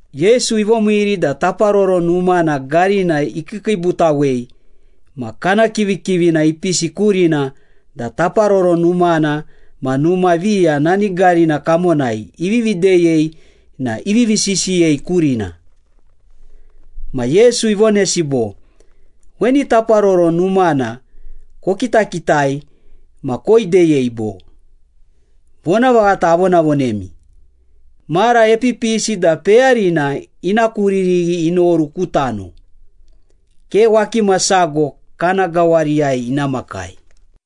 Yesu ivomiiri da Taparoro Numana garina ikiikiibutawei ma kana kivikivina ipisi kurina da Taparoro Numana ma numa viya nani garina kamonai ivivi deyei na ivivi sisiyei kurina. Ma Yesu ivonesi bo, “Weni Taparoro Numana kokitakitai ma koideyei, bo? Vonavaghata avonavonemi, mara epipisi da peyarina ina kuririghi inoru ku tano, ke wakima sago kana gawariyai ina makai.”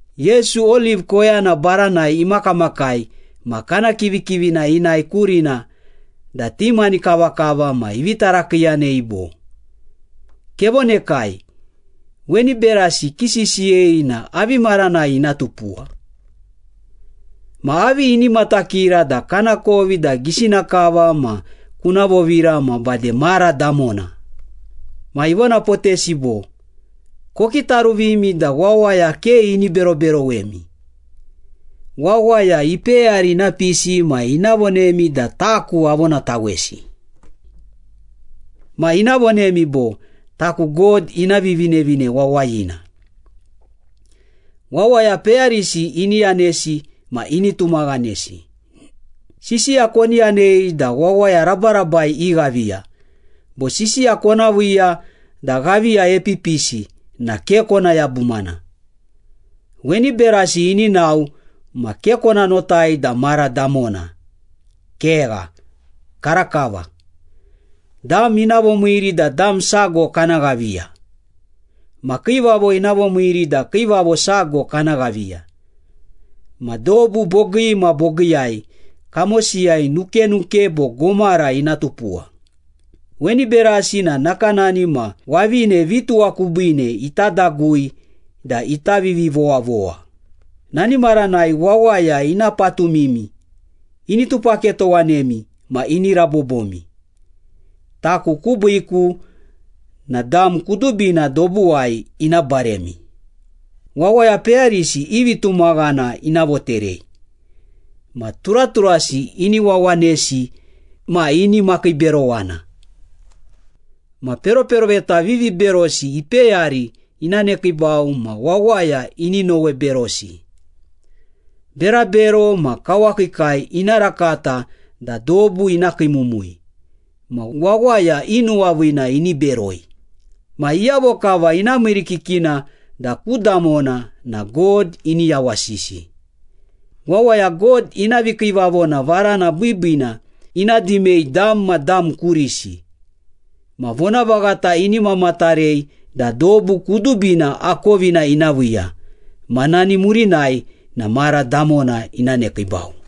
Yesu Oliv koyana baranai imakamakai ma kana kivikivina inae kurina da ti mani kavakava ma ivi tarakiiyanei bo, “Kevonekai, weni berasi kisisiyei na avi maranai ina tupuwa? Ma avi ini matakira da kanakovi da gisina kava ma kuna vovira ma bade mara damona?” Ma ivonapotesi bo, “Kokitaruvimi da wawaya ke ini beroberowemi. Wawaya ipeyari ina pisi ma ina vonemi da taku avonatawesi. Ma ina vonemi bo, ‘Taku God ina Vivinevine Wawayina!’ Wawaya peyarisi ini yanesi ma ini tumaghanesi. Sisiya koni yanei da wawaya rabarabai ighaviya, bo sisiya kona viiya da ghaviya epipisi na ke kona yabumana. Weni berasi ini nao ma ke kona notai da mara damona. Kegha, karakava. Dam ina vomiiri da dam sago kana ghaviya. Ma kiivavo ina vomiiri da kiivavo sago kana ghaviya. Ma dobu bogii ma bogiiyai kamosiyai nukenuke bo gomara ina tupuwa. Weni berasi na nakanani ma wavine vituwa kubiine ita dagui da ita vivivowavowa.” “Nani maranai wawaya ina patumimi, ini tupaketowanemi ma ini rabobomi. Taku kubiiku na dam kudubina dobuwai ina baremi. Wawaya peyarisi i vitumaghana ina voterei. Ma turaturasi ini wawanesi ma ini makiiberowana. Ma peroperoveta viviberosi ipeyari ina nekiibau ma wawaya ini noweberosi. Berabero ma kawakiikai ina rakata da dobu ina kiimumui, ma wawaya i nuwaviina ini beroi. Ma iyavo kava ina miirikikina da ku damona na God ini yawasisi. Wawaya God ina vikiivavona varana biibiina ina dimei dam ma dam kurisi. Ma vonavaghata ini mamatarei da dobu kudubina akovina ina viiya. Ma nani murinai na mara damona ina nekiibau.”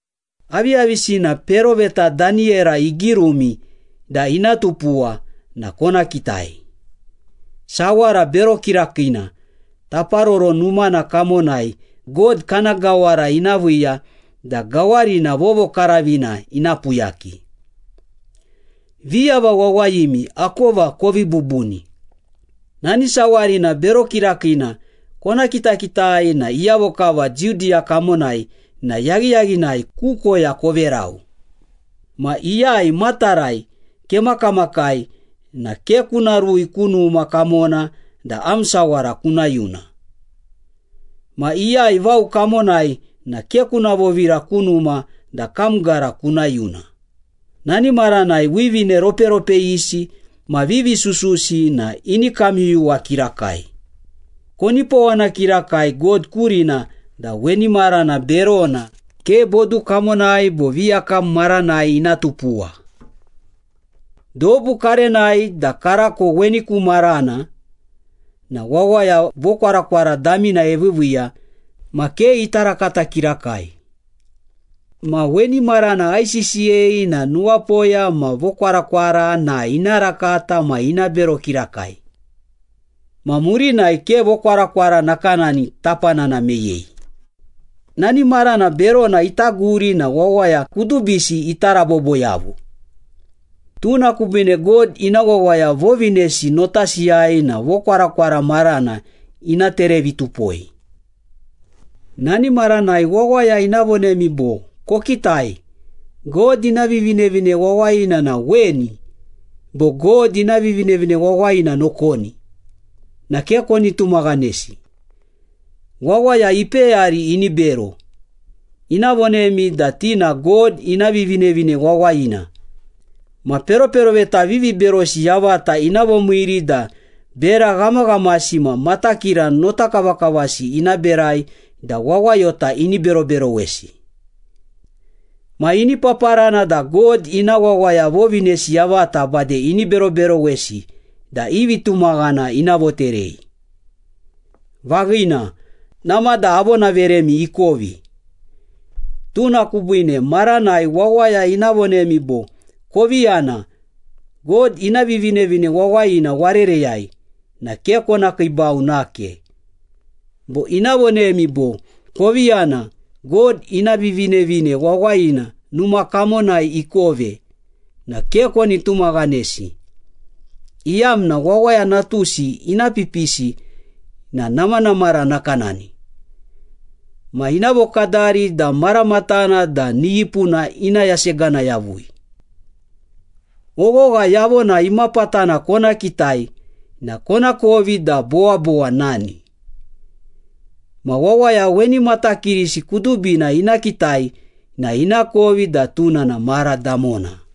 “Aviyavisina peroveta Daniyera igirumi da ina tupuwa na kona kitai. ‘Sawara Bero Kirakiina’ Taparoro Numana kamonai God kana gawara ina viiya da gawarina vovokaravina ina puyaki.” (Viyava wawayimi akova kovii bubuni.) “Nani sawarina bero kirakiina kona kitakitai na iyavo kava Judiya kamonai na yaghiyaghinai ku koya koverau. Ma iyai matarai kemakamakai na ke kuna rui ku numa kamona da am sawara kuna yuna. Ma iyai vao kamonai na ke kuna vovira ku numa da kam gara kuna yuna. Nani maranai wivine roperopeyisi ma vivi sususi na ini kamyuyuwa kirakai. Konipowana kirakai God kurina da weni marana berona ke bodu kamonai bo viyakam maranai ina tupuwa. Dobu karenai da karako weni ku marana na wawaya vokwarakwara damina eviiviiya ma ke ita rakata kirakai. Ma weni marana aisisiyei na nuwapoya ma vokwarakwara na ina rakata ma ina bero kirakai. Ma murinai ke vokwarakwara nakanani tapanana meyei. Nani marana berona ita guri na wawaya kudubisi ita rabobo yavu. Tuna kubiine God ina wawaya vovinesi notasiyai na vokwarakwara marana ina terevitupoi.” “Nani maranai wawaya ina vonemi bo, ‘Kokitai, God ina Vivinevine Wawayina na weni’ bo ‘God ina Vivinevine Wawayina nokoni’ na ke koni tumaghanesi. Wawaya ipeyari ini bero, ina vonemi da ti na God ina Vivinevine Wawayina ma peroperoveta viviberosi yavata ina vomiiri da bera ghamaghamasi ma matakira notakavakavasi ina berai da wawayota ini beroberowesi. Ma ini paparana da God ina wawaya vovinesi yavata bade ini beroberowesi da i vitumaghana ina voterei. Vaghina, namada avonaveremi ikovi, tuna kubiine maranai wawaya ina vonemi bo, ‘Kovi yana, God ina Vivinevine Wawayina warereyai’ na ke kona kiibau nake. Bo ina vonemi bo, ‘Kovi yana, God ina Vivinevine Wawayina numa kamonai ikove’ na ke koni tumaghanesi, iyamna Wawaya Natusi ina pipisi na namanamara nakanani. Ma ina vokadari da maramatana da niyipuna ina yasegana yavui.” “Oghogha yavona imapatana kona kitai na konakovi da bowabowa nani. Ma wawaya weni matakirisi kudubina ina kitai na inakovi da tuna na mara damona.”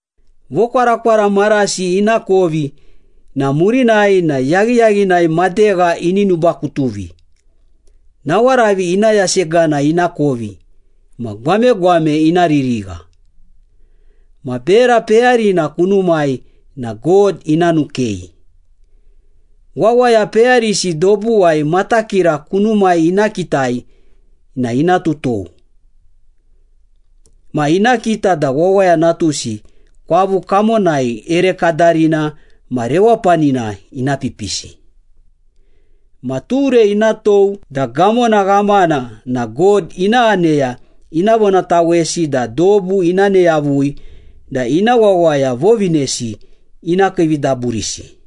“Vokwarakwara marasi ina kovi na murinai na yaghiyaghinai madegha ini nubakutuvi, nawaravi ina yasegana ina kovi, ma gwamegwame ina ririgha. Ma bera peyarina kunumai na God ina nukei. Wawaya peyarisi dobuwai matakira kunumai ina kitai na ina tutou. Ma ina kita da Wawaya Natusi kwavu kamonai ere kadarina ma rewapanina ina pipisi. Ma ture ina tou da gamona ghamana na God ina aneya ina vonatawesi da dobu ina ne yavui da ina wawaya vovinesi ina kiividaburisi.”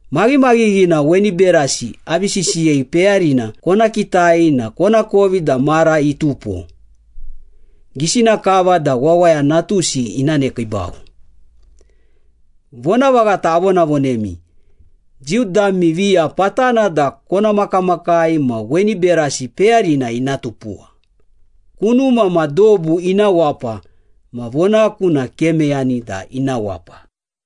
Maghimaghighina weni berasi avi sisiyei peyarina kona kitai na konakovi da mara itupo, gisina kava da Wawaya Natusi ina nekiibau. Vonavaghata avonavonemi, Jiu dami viya patana da kona makamakai ma weni berasi peyarina ina tupuwa. Kunuma ma dobu ina wapa ma vonaku na ke meyani da ina wapa.”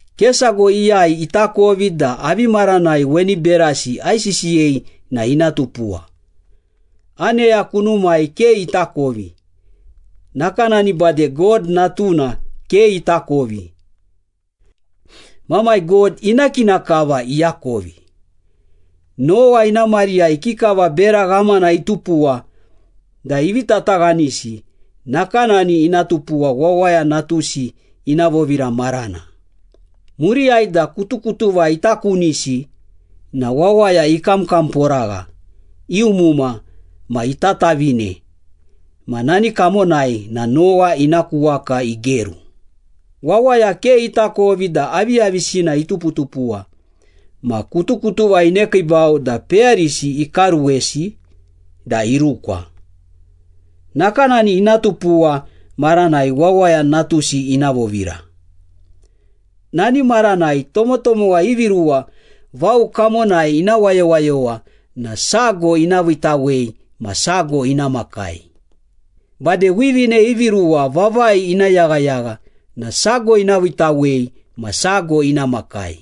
“Ke sago iyai itakovi da avi maranai weni berasi aisisiyei na ina tupuwa. Aneya kunumai ke itakovi, nakanani bade God Natuna ke itakovi. Mamai God ina kina kava iakovi. Nowa ina mariyai ikikava bera ghamana itupuwa da ivi tataghanisi, nakanani ina tupuwa Wawaya Natusi ina vovira marana. Muriyai da kutukutuva ita kunisi na wawaya ikamkamporagha, iumuma, ma itatavine ma nani kamonai na Nowa ina ku waka igeru. Wawaya ke itakovi da aviyavisina ituputupuwa ma kutukutuva inekiibau da peyarisi ikaruwesi da irukwa. Nakanani ina tupuwa maranai Wawaya Natusi ina vovira. Nani maranai tomotomowa ivi ruwa vao kamonai ina wayowayowa na sago ina viitawei ma sago ina makai. Bade wivine ivi ruwa vavai ina yaghayagha na sago ina viitawei ma sago ina makai.”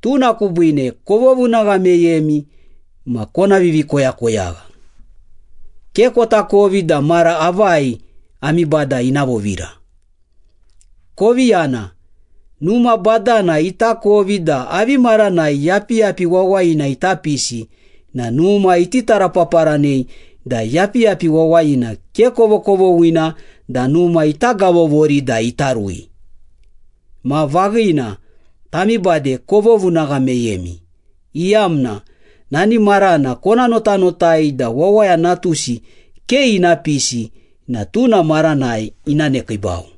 “Tuna kubiine kovovunagha meyemi ma kona vivikoyakoyagha. Ke kotakovi da mara avai ami Bada ina vovira. Koviyana. Numa badana itakovi da avi maranai yapiyapi wawayina ita pisi na numa iti tarapaparanei da yapiyapi wawayina ke kovokovoghina da numa ita gavovori da ita rui. Ma vaghina, tami bade kovovunagha meyemi, iyamna nani marana kona notanotai da Wawaya Natusi ke ina pisi na tuna maranai ina nekiibau.”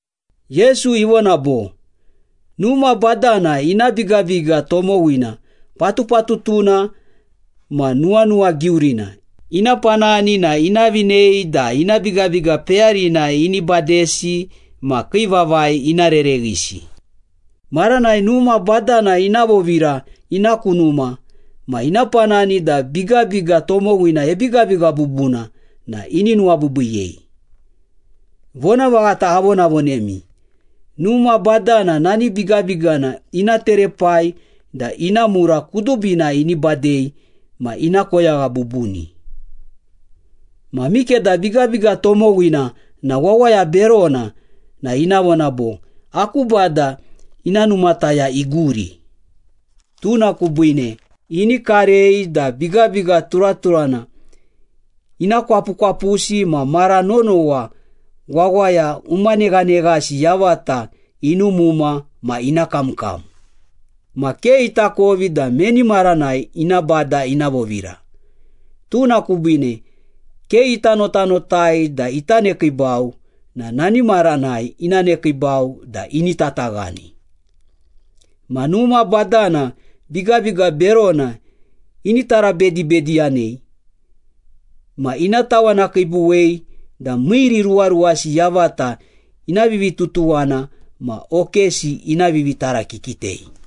Yesu ivona bo, “Numa badana ina bigabiga tomowina patupatutuna ma nuwanuwagiurina ina panani na ina vinei da ina bigabiga peyarina ini badesi ma kii vavai ina rereghisi. Maranai numa badana ina vovira ina ku numa ma ina panani da bigabiga tomowina ebigabiga bubuna na ini nuwabiibiiyei. Vonavaghata avonavonemi, numa badana nani bigabigana ina terepai da ina mura kudubina ini badei ma ina koyagha bubuni. Ma mikeda bigabiga tomowina na wawaya berona na ina vona bo, ‘Aku bada ina numataya iguri.’ Tuna kubiine ini karei da bigabiga turaturana ina kwapukwapusi ma mara nonowa wawaya umaneghaneghasi yavata inumuma ma ina kamkam. Ma ke itakovi da meni maranai ina bada ina vovira, tuna kubiine ke ita notanotai da ita nekiibau na nani maranai ina nekiibau da ini tataghani. Ma numa badana bigabiga berona ini tarabedibediyanei ma ina tawanakiibuwei da miiriruwaruwasi yavata ina vivitutuwana ma okesi ina vivitarakikitei.”